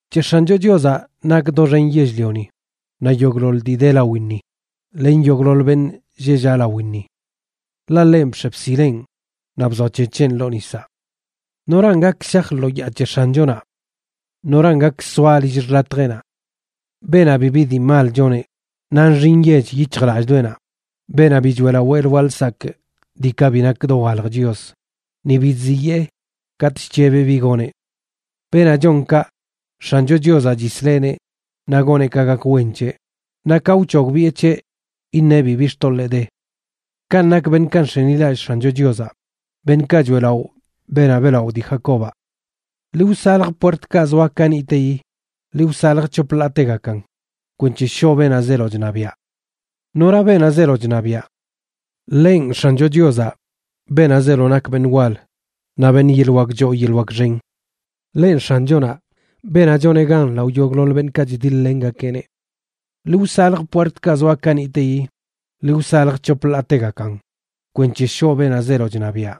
C̱he X̱ancho Chiozaꞌ nak doxen yell-lioni naꞌ yogꞌḻoḻ dii de lawinni, len yogꞌḻoḻ beṉꞌ lleꞌ llaꞌ lawinni. Ḻaꞌ ḻenꞌ bx̱e bsileꞌn naꞌ bzoac̱hec̱heꞌn ḻoo nisaꞌ. ¿Noran gak shaj lo yaa c̱he X̱anchonaꞌ? ¿Noran gak soa lill xḻatjeꞌnaꞌ? Beenaꞌ bibi dii mal choneꞌ, naꞌ nxi nyech yic̱hjlallꞌdoꞌenaꞌ; beenaꞌ bi choeꞌlaꞌo lwaa lsakꞌ diikaꞌ bi nak dowalj chios, ni bi chziyee katꞌ chc̱hebeꞌ bi goneꞌ. Beenaꞌ chon kaꞌ, X̱ancho Chiozaꞌ chisleꞌneꞌ naꞌ goneꞌ ka gak wen c̱heꞌ, naꞌ ka wc̱hogbiꞌe c̱heꞌ, iṉeꞌ bibi xtoḻee de. Kanꞌ nak beṉꞌkaꞌ nx̱enilallꞌ X̱ancho Chiozaꞌ, beṉꞌkaꞌ choeꞌlaꞌo beenaꞌ beꞌlaꞌo dii Jacobaꞌ. ¡Ḻi wsalj puertkaꞌ zoa kaniꞌteyi! ¡Ḻi wsalj c̱hop ḻaategakan kwenc̱he shoꞌ beenaꞌ zeelo chṉabiaꞌ! ¿Nora beenaꞌ zeelo chṉabiaꞌ? Ḻenꞌ X̱ancho Chiozaꞌ, beenaꞌ zeelo nak beṉꞌ wal naꞌ beṉꞌ yeḻꞌ wak choo yeḻꞌ wak xen. Ḻenꞌ X̱anchonaꞌ, beenaꞌ choneꞌ gan lao yogꞌḻoḻ beṉꞌkaꞌ chdiḻ-lengakeꞌneꞌ. ¡Ḻi wsalj puertkaꞌ zoa kaniꞌteyi! ¡Ḻi wsalj c̱hop ḻaategakan kwenc̱he shoꞌ beenaꞌ zeelo chṉabiaꞌ!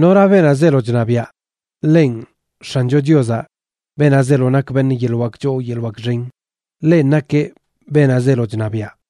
¿Nora beenaꞌ zeelo chṉabiaꞌ? Ḻenꞌ X̱ancho Chiozaꞌ, beenaꞌ zeelo nak beṉꞌ yeḻꞌ wak choo yeḻꞌ wak xen. Ḻenꞌ nakeꞌ beenaꞌ zeelo chṉabiaꞌ.